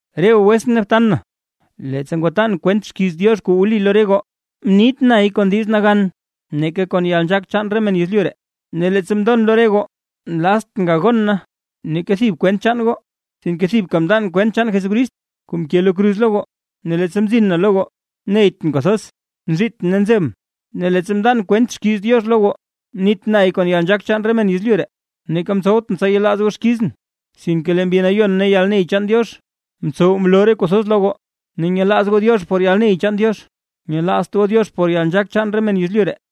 Re goo wetsʼn ne btan na, leettsa ngwatan kwent xkiiz Diox kuu wli lo re goo, mnit nay kon diiz kuu nagan neeka kon yalnzhaak chaan re men yezlyu ree. Ne leettsa mndon lo re goo, nlaztʼn gagon na neeka thib kwent chaan goo, sinke thibka mndan kwent chaan Jesucrist kuu mke lo kruz lo goo. Ne leettsa mzin na lo goo, neytʼn kwathoz nzhiitʼn ne nzebʼn, ne leettsa mndan kwent xkiiz Diox lo goo, mnit nay kon yalnzhaak chaan re men yezlyu ree, neeka mtsowtʼn tsa yelaaz goo xkizʼn. Sinke lee Mbi Nayon ne yalney chaan Diox mtsow mloo re kuu thoz lo goo. Ne nyelaaz goo Diox por yalney chaan Diox, nyelaazt goo Diox por yalnzhaak chaan re men yezlyu ree.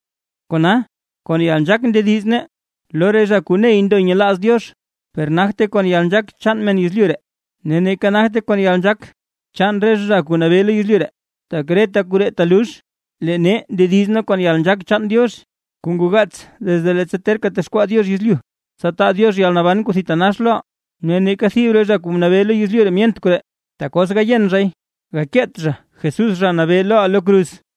Kona, kon yalnzhaak ndediz nee lo re zha kuu ney ndo nyelaaz Diox, per nagte kon yalnzhaak chaan men yezlyu ree, ne neeka nagte kon yalnzhaak chaan re zha kuu nabee lo yezlyu ree, tak reta koree telux. Lee nee ndediz nee kon yalnzhaak chaan Diox, kuu ngoo gaats desde leettsa terka texkwaa Diox yezlyu, tsa taa Diox yalnaban kuu thitanax loʼaa. Ne neeka thib re zha kuu mnabee lo yezlyu ree myent koree, tak os gayen zhay, gakeet zha Jesús Zha Nabee loʼaa lo kruz.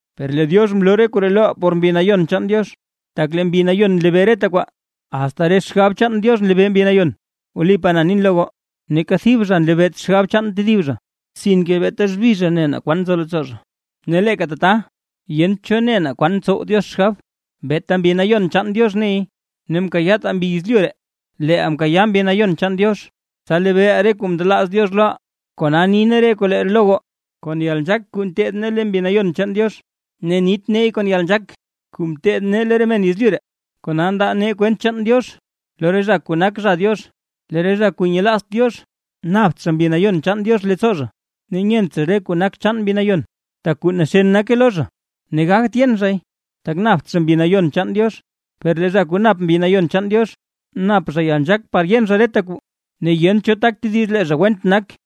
Per lee Diox mloo re koree loʼaa por Mbi Nayon chaan Diox, tak lee Mbi Nayon nlebee reta kwaa, asta re xgab chaan Diox nlebee Mbi Nayon. Wlipaa nin lo goo, neeka thib zha nlebeet xgab chaan tedib zha, sinke beeta xbi zha ne naa kwan nzo leettsoo zha. Ne leeka tata yent cho ne naa kwan ntsow Diox xgab, beeta Mbi Nayon chaan Diox ney. Ne mkayaataa mbi yezlyu ree, leeʼaa mkayaa Mbi Nayon chaan Diox, tsa lebeeʼaa re kuu mndelaaz Diox loʼaa. Kona ni nee re koree lo goo, kon yalnzhaak kuu nteed nee lo Mbi Nayon chaan Diox, ne nit neey kon yalnzhaak kuu mteed nee lo re men yezlyu ree, kona ndaa nee kwent chaan Diox lo re zha kuu nak zha Diox. Lee re zha kuu nyelaazt Diox, napt zha Mbi Nayon chaan Diox leettsoo, ne nyent zha re kuu nak chaan Mbi Nayon, tak kuu naxen nake lo zha. Ne gagt yen zhay, tak napt zha Mbi Nayon chaan Diox. Per lee zha kuu nap Mbi Nayon chaan Diox, nap zha yalnzhaak par yen zha reta kuu, ne yent cho tak tediz lee zha went nak.